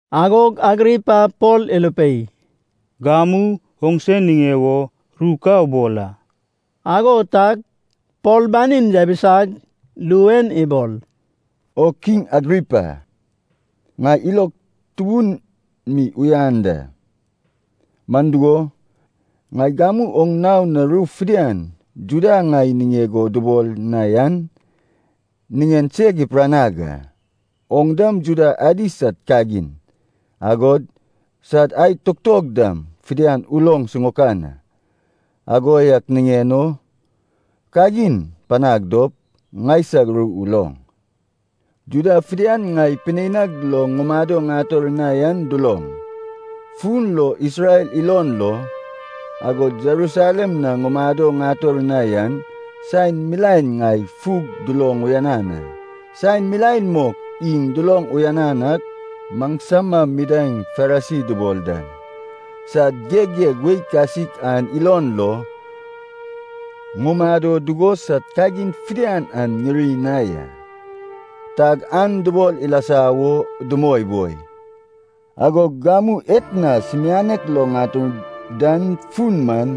Agog Agripa Pol irupei, “Gamu oŋse niŋe wo ru ka ubol a.” Ago tag Pol banin yabisag, ru en ibol, “O Kiŋ Agripa, ŋai ilog tubun mi uyan da. Man dugo, ŋai gamu oŋ nao na ru fidian Juda ŋai niŋeg o dubol na yan niŋen seg ipiranag a. Oŋ dam Juda adi sad kagin, agod sad ae tutog dam fidian uloŋ siŋaokan a. Ago yak niŋen o kagin panag dop, ŋaisag ru uloŋ. “Juda fidian ŋai pineinag lo ŋumado ŋator na yan duloŋ. Fun lo Isrel ilon lo, agod Jerusalem na ŋumado ŋator na yan, saen milaen ŋai fug duloŋ uyanan a. Saen milaen mok iŋ duloŋ uyanan ak, maŋsama midaeŋ Farisi dubol dan san geggeg wei kasik an ilon lo ŋumado dugo sad kagin fidian an ŋiri na ya. Tag an dubol ilasa wo dumoi boi. Agog gamu etna sumianek lo ŋatur dan fun man,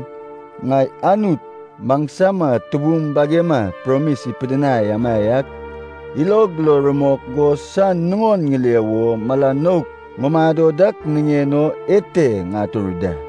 ŋai Anut maŋsama tubum bagema promis ipidinai amaiak ilog lo rumok go san nuŋon ŋile wo mala nouk ŋumado dak niŋen o ete ŋatur da.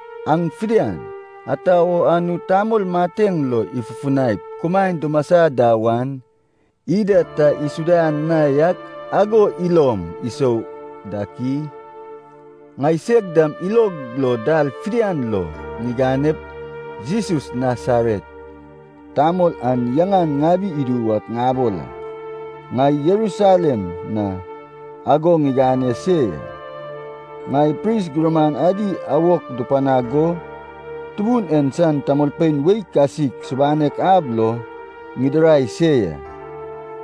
Aŋ fidian, ata wo Anut tamol mateŋ lo ifufunaip kumaen dumasa da wan, ida ta isuda na yak ago ilom isou dak i? “Ŋaiseg dam ilog lo dal fidian lo ŋiganep Jesus Nasaret tamol an yaŋan ŋabi idu wak ŋabol a. Ŋai Jerusalem na ago ŋigane se ya. Ŋai pris gurman adi awok dupanag go Tubun en san tamolpein wei kasik subanek ab lo ŋidirai se ya.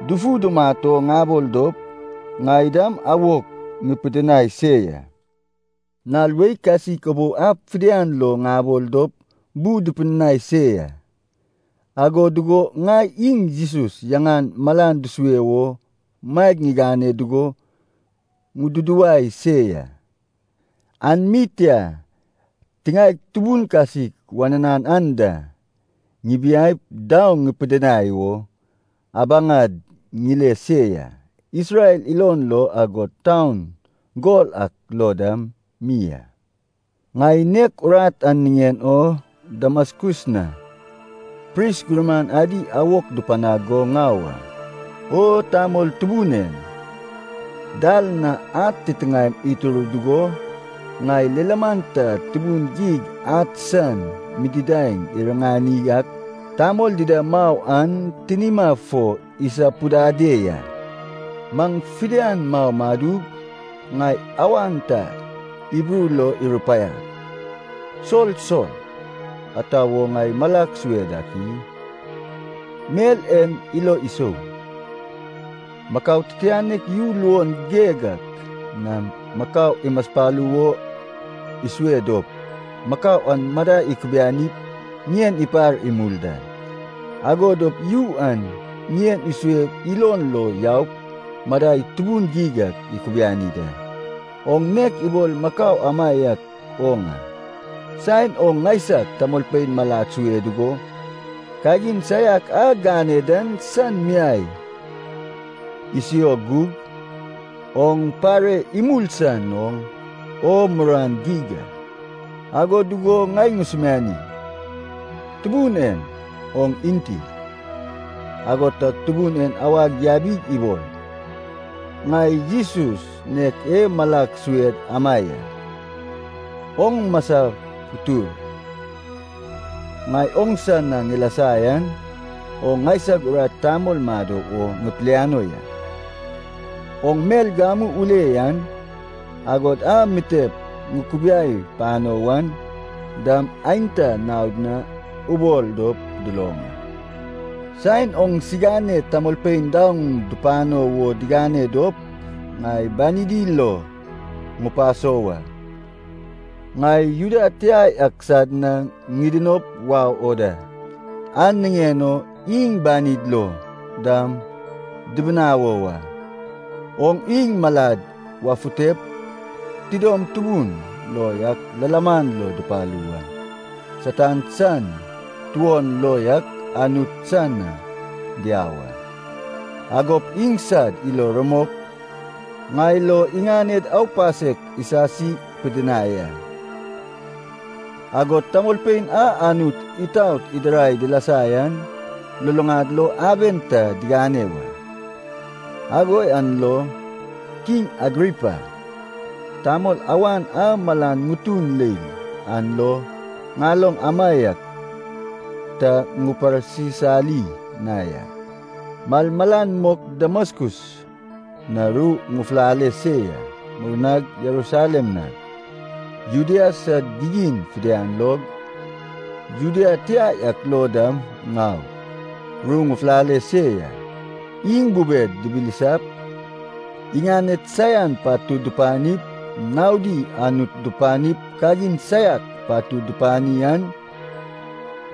Dufu dumat o dubol dop, ŋai dam awok ŋupidinai se ya. Nal wei kasik ubou ab fidian lo ŋabol dop bu dupidinai se ya. Ago dugo ŋai iŋ Jesus yaŋan malan dusue wo maeg ŋigane dugo ŋududuwai se ya. An mi tia, tiŋaeg tubun kasik wananan anda, ŋibiaip daoŋ ŋupidinai wo abaŋad ŋile se ya, Isrel ilon lo agod taun gol ak lo dam mi a. “Ŋai nek urat an niŋen o Damaskus na pris gurman adi awok dupanag go ŋau a. O tamol tubun en, dal na ad titiŋaem itur dugo ŋai lilaman ta tubun geig ad san mididaŋ iriŋani ak tamol dida mau an tinima fo isapudade ya. Maŋ fidian mau madug, ŋai awan ta Hibru lo irupaiag, ‘Sol! Sol! Ata wo ŋai malag sue dak i? Mel en ilo isou. Makau titianek yu luon geig ak nam makau imaspalu wo isue dop, makau an madai ikubianip ŋien ipar imul da, ago dop yu an ŋien isue ilon lo yaup madai tubun geig ak ikubiani da. Oŋ nek ibol makau amaiak oŋ a. Saen oŋ ŋaisag tamolpein malad sue dugo, kagin saiak a gane dan san miai isio gug, oŋ pare imul san oŋ o muruan geig a.’ “Ago dugo ŋai ŋusumiani, ‘Tubun en, oŋ enti?’” “Ago tag Tubun en awag yabig ibol, ‘Ŋai Jesus nek e malag sued ama ya. Oŋ masap utur. Ŋai oŋsa na ŋilasa yan oŋ ŋaisag urat tamol mado wo ŋipiliano ya. Oŋ mel gamu ule yan, agod a mitep ŋukubiai pano wan dam aenta naod na ubol dop duloŋ a. Saen oŋsigane tamolpein daoŋ dupano wo digane dop, ŋai banidi lo ŋupaso wa. Ŋai Juda tia yak sad na ŋidinop wau o da, an niŋen o iŋ banid lo dam ŋibinawo wa. Oŋ iŋ malad wafutep, tidom tubun lo yak lilaman lo dupalu wa. Satan san tuon lo yak Anut san na diau a. Agop iŋsad ilo rumok ŋai lo iŋaned aupasek isasi pidinai a, agod tamolpein a Anut itaot idirai dilasa yan luluŋad lo aben ta diŋane wa.’” “Ago yan lo, Kiŋ Agripa, tamol awan a mala ŋutun leil an lo ŋaloŋ amaiak ta ŋuparsisali na ya. Malmalan mok Damaskus na ru ŋufulale se ya. Murnag Jerusalem nag, Judea sad gigin fidian log, Juda tia yak lo dam ŋaug, ru ŋufulale se ya. Iŋ bubed dibilisap, iŋaned saian patud dupanip, naodi Anut dupanip kagin saiak patud dupani an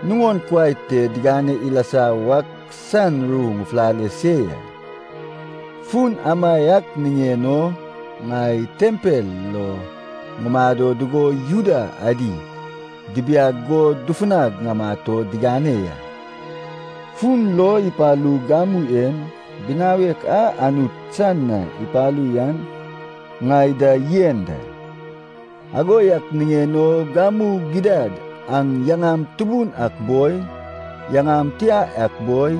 nuŋon kuai te digane ilasa wak san ru ŋufulale se ya. Fun amaiak niŋen o ŋai tempel lo ŋumado dugo Juda adi dibiag go dufunag ŋamat o digane ya. Fun lo ipalug gamu en, binawek a Anut san na ipalu yan ŋai da yen da. Ago yak niŋen o gamu gidad aŋ yaŋam tubun ak boi, yaŋam tia yak boi,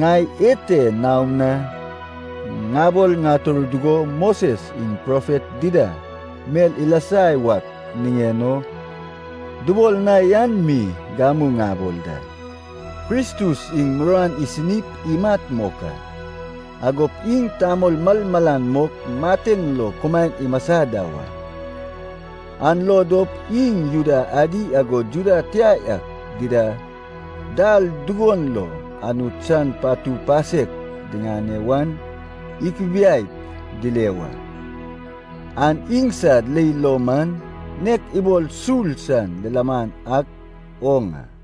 ŋai ete naom na ŋabol ŋatur dugo, Moses iŋ profet dida mel ilasa wak niŋen o dubol na yan mi gamu ŋabol da: Kristus iŋ muruan isinip imat mok a. Agop iŋ tamol malmalan mok mateŋ lo kumaen imasa da wa. An lo dop iŋ Juda adi agod Juda tia yak dida dal dugon lo Anut san patu pasek diŋane wan ikubiaip dile wa. An iŋsad leil lo man nek ibol sul san lilaman ak oŋ a.”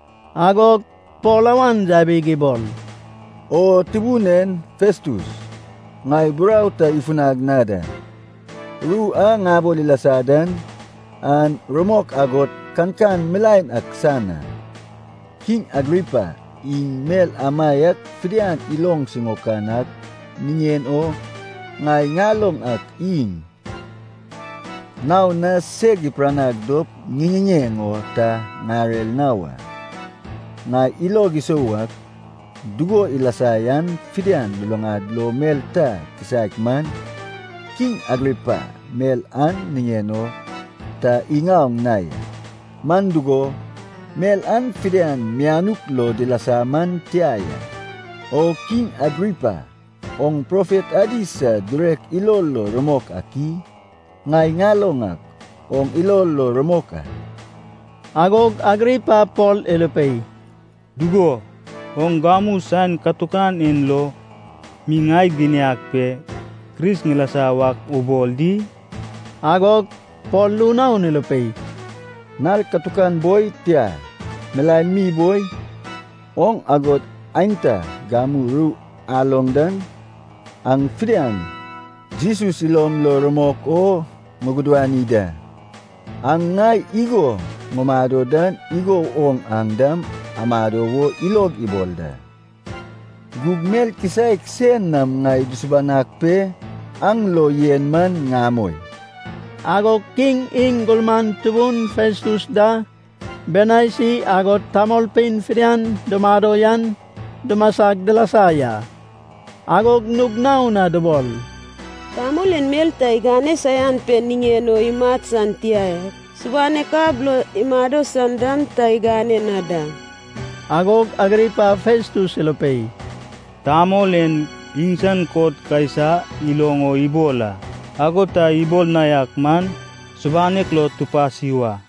Agog Pol awan yabig ibol, “O tubun en Festus, ŋai burau ta ifunag na da. Ru a ŋabol ilasa dan, an rumok agod kankan milaen ak san a. Kiŋ Agripa, iŋ mel amaiak fidian iloŋ siŋaokan ak niŋen o ŋai ŋaloŋ ak iŋ naon na seg ipiranag dop ŋiŋiŋeŋ o ta ŋarer na wa. Ŋai ilog isou ak, dugo ilasa yan fidian luluŋad lo mel ta kisaek man, kiŋ Agripa mel an niŋen o ta iŋaoŋ na ya. Man dugo, mel an fidian mianuk lo dilasa man tia ya. O Kiŋ Agripa, oŋ profet adi sad girek ilo lo rumok ak i? Ŋai ŋaloŋ ak, oŋ ilo lo rumok a.” Agog Agripa Pol irupei, “Dugo, oŋ gamu saen katukan en lo mi ŋai giniag pe Kris ŋilasa wak ubol di?” Agog Pol ru naon irupei, “Nal katukan boi, tia, milaen mi boi, oŋ agod aenta gamu ru aloŋ dan aŋ fidian Jesus ilom lo rumok o ŋugudani da. Aŋ ŋai igo ŋumado dan igo woŋ aŋ dam amado wo ilog ibol da. Gug mel kisaek sein nam ŋai dusubanag pe aŋ lo yen man ŋamoi.” Agog kiŋ, iŋ gurman tubun Festus da, Bernaisi, agod tamolpein fidian dumado yan dumasag, dilasa ya. Agog nug naon na dubol, “Tamol en mel ta igane saian pe niŋen o imat san tia ya, subanek ab lo imado san dam ta igane na da.” Agog Agripa Festus irupei, “Tamol en iŋsan kot Kaisa iloŋ o ibol a. Ago ta ibol na yak man subanek lo tupasi wa.”